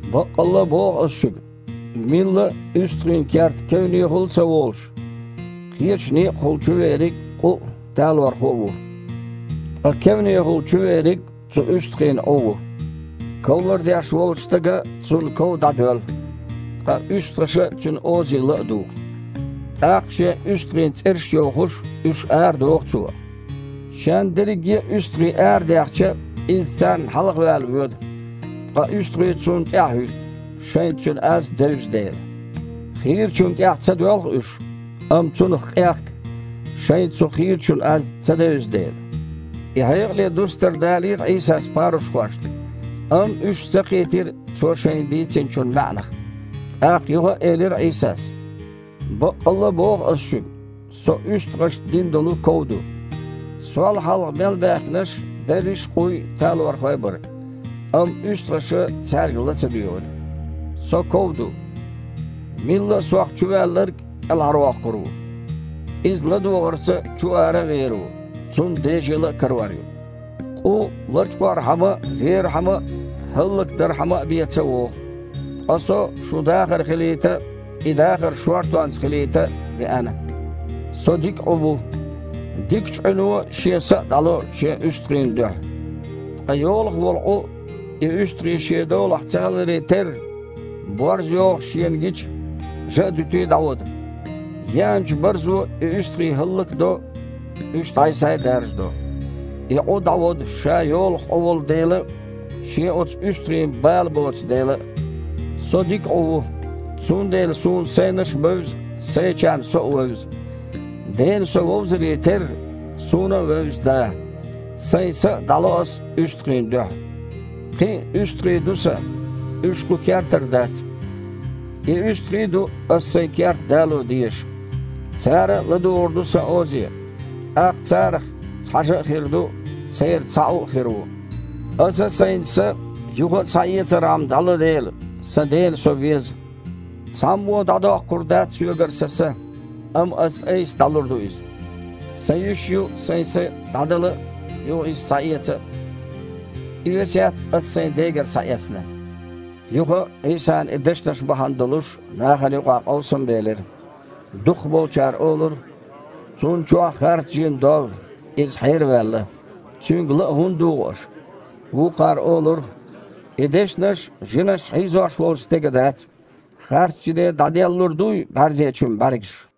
«Баккъалла а боху Ас шуьга: милла а, уьстагІийн кертан кевнехула а ца волуш, кхечу некъахула чувериг, къу а, талорхо а ву. Ткъа кевнехула чувериг цу уьстагІийн Іу ву. Ков лардеш волчу стага цунна ков дІадоьллу, ткъа уьстагІаша цуьнан озе ла а дугІу. ТІаккха, шен уьстагІийн цІераш а йохуш, уьш арадоху цо. Шен дерриге а уьстагІий арадаьхча, иза царна хьалхаваьлла воьду, ткъа уьстагІий цунна тІаьхьахІуьтту, шайна цуьнан аз девза дела. Хийрачунна тІаьхьа ца доьлху уьш, амма цунах къехка, шайна цу хийрачун аз ца девза дела». И хьекъале дустар далийра Іийсас парушхошна. Амма уьш ца кхийтира Цо шайна дийцинчун маьІнах. ТІаккха юха а элира Іийсас: «Баккъалла а боху Ас шуьга: Со уьстагІашна дина долу ков ду. Сол хьалха мел баьхкинарш берриш къуй а, талорхой а бара. Амма уьстагІаша цаьрга ла ца дуьйгІира. Со ков ду. Милла а Сох чуваьлларг кІелхьарвоккхур ву. Иза ладогІарца чу-ара а вер ву, цунна дежийла а карор ю. Къу лачкъорхьама а, верхьама а, хІаллакдархьама а бен ца вогІу. Ткъа Со шун дахар хилийта а, и дахар шортонца хилийта а веана. Со дика Іу ву. Дикачу Іуьно шен са а дІало шен уьстагІийн дуьхьа. Ткъа йолах волу Іу, и уьстагІий шен долахь ца хиларе терра, борз йогІуш шена гича, жа а дуьтий, дІаводу. Еанчу барзо и уьстагІий хІаллак а до, уьш дІай-схьай а даржадо. И Іу дІаводу, ша йолах Іу волу дела а, шен оцу уьстагІийн бала а боцу дела а. Со дика Іу ву, цундела Суна сайнаш а бевза, сайчарна Со а вевза. Дена Со вовзаре терра, Суна а вевза Да. Сайн са а дІало Ас уьстагІийн дуьхьа. Кхин а уьстагІий ду Сан. Уьш кху кертара дац. И уьстагІий а ду Ас Сайн керта дало дезаш. Цара а ладугІур ду Сан озе, тІаккха царах цхьа жа а хир ду, церан цхьа Іу а хир ву. Аса Сайн са, юха а схьаэцархьама, дІало дела, Сан Дена Со веза. Цхьаммо а дІадоккхур дац Соьгара Сан са, амма Аса-Айса дІалур ду иза. Сан йиш ю Сайн са дІадала а, иза юха схьаэца а. И весет Ас Сайн Дегара схьаэцна». Юха а, Іийсан и дешнаш бахьана долуш, нахана юкъахь къовсам белира. Дукхахболчара олура: «Цунна чохь харц жин доллу, Иза хьераваьлла. Цуьнга ла а хІунда дугІу аша?» Вукхара олура: «И дешнаш жинаша хьийзош волчу стеган дац. Харц жине дІаделлалур дуй бІаьрзечун бІаьргаш?»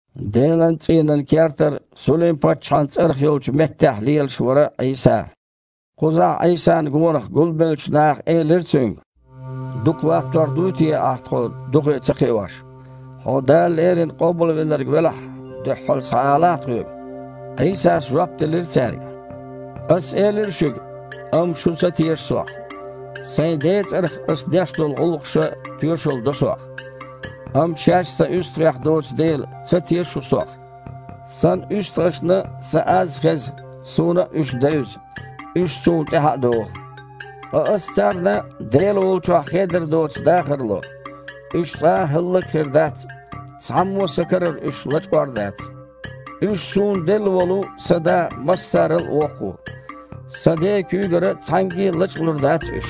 Делан цІийнан кертара Сулим-паччахьан цІарах йолчу меттехь лелаш вара Іийса. Кхузахь Іийсана гонах гулбеллачу наха элира Цуьнга: «Дукха латтор дуй те Ахь тхо духе ца кхиош? Хьо Дала леррина Къобалвинарг велахь, дуьххьал схьаалахьа тхоьга». Іийсас жоп делира цаьрга: «Ас элира шуьга, амма шу ца теша Сох. Сайн Ден цІарах Ас деш долчу гІуллакхаша тоьшалла до Сох. Амма шаьш Сан уьстагІех доцу дела, ца теша шу Сох. Сан уьстагІашна Сан аз а хеза, Суна а уьш девза, уьш Суна тІаьхьа а догІу. Ткъа Аса царна Дела волчохь хедар доцу дахар ло, уьш цкъа а хІаллак а хир дац, цхьаммо а Сан карара уьш лачкъор а дац. Уьш Суна делла волу Сан Да массарал а воккха ву. Сан Ден куьйгара цхьаьнгге а лачкъалур дац уьш.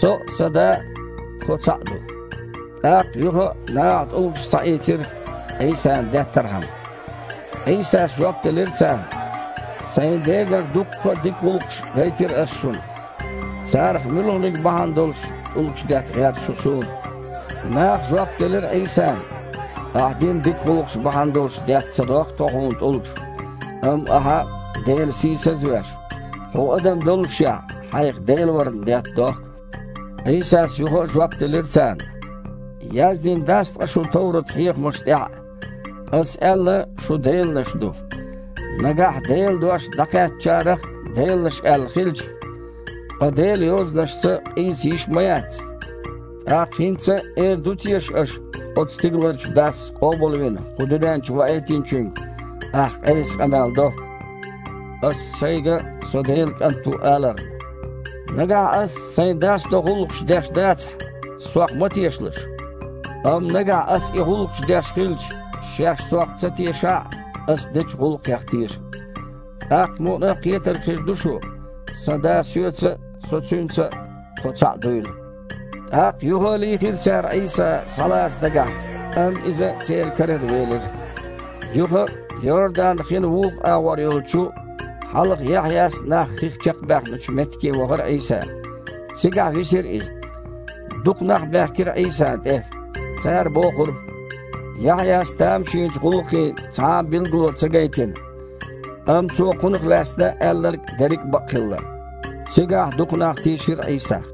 Со а, Сан Да а – Тхо цхьаъ ду». ТІаккха юха а наха тІулгаш схьаийцира, Іийсана деттархьама. Іийсас жоп делира царна: «Сайн Дегара дуккха а дика гІуллакхаш гайтира Ас шуна. Царах муьлханиг бахьана долуш тІулгаш детта гІерта шу Суна?» Наха жоп делира Іийсана: «Ахьа дина дика гІуллакхаш бахьана долуш детта ца дохку тхо Хьуна тІулгаш, амма Ахьа, Дела сийсаз а веш, Хьуо адам доллушехь, Хьайх Дела варна детта дохку». Іийсас юха а жоп делира царна: «Яздина дац ткъа шун товрат хьехамаш тІехь а: „Ас аьлла, шу деланаш ду“? Нагахь Делан дош дІакхаьчначарех а деланаш аьлла хилча (ткъа Делан Йозанашца къийса йиш ма-яц), тІаккха хІинца а эр ду те аша, оцу стигаларчу Дас къобалвина кху дуьнен чу Ваийтинчуьнга: „Ахь Іеса къамел до“, – Ас шайга: „Со Делан КІант ву“, – аларна? Нагахь Ас Сайн Дас до гІуллакхаш деш дацахь, Сох ма тешалаш. Амма, нагахь Ас и гІуллакхаш деш хилча, шаьш Сох ца тешахь а, Ас дечу гІуллакхех теша. ТІаккха мукъана а кхетар хир ду шу, Сан Да Соьца а, Со Цуьнца а – тхо цхьаъ дуйла». ТІаккха юха а лийхира цара Іийса, схьалаца дагахь, амма Иза церан карара велира. Юха а Йордан-хин вукху агІор йолчу, хьалха Яхьъяс нах хих чекхбаьхначу меттиге вахара Іийса. Цигахь висира Иза. Дукха нах баьхкира Іийсана тІе. Цара бохура: «Яхьъяс тамашийначу гІуллакхийн цхьа а билгало ца гайтина, амма цо Кхунах лаьцна аьлларг дерриг а бакъ хилла». Цигахь дукха нах тийшира Іийсах.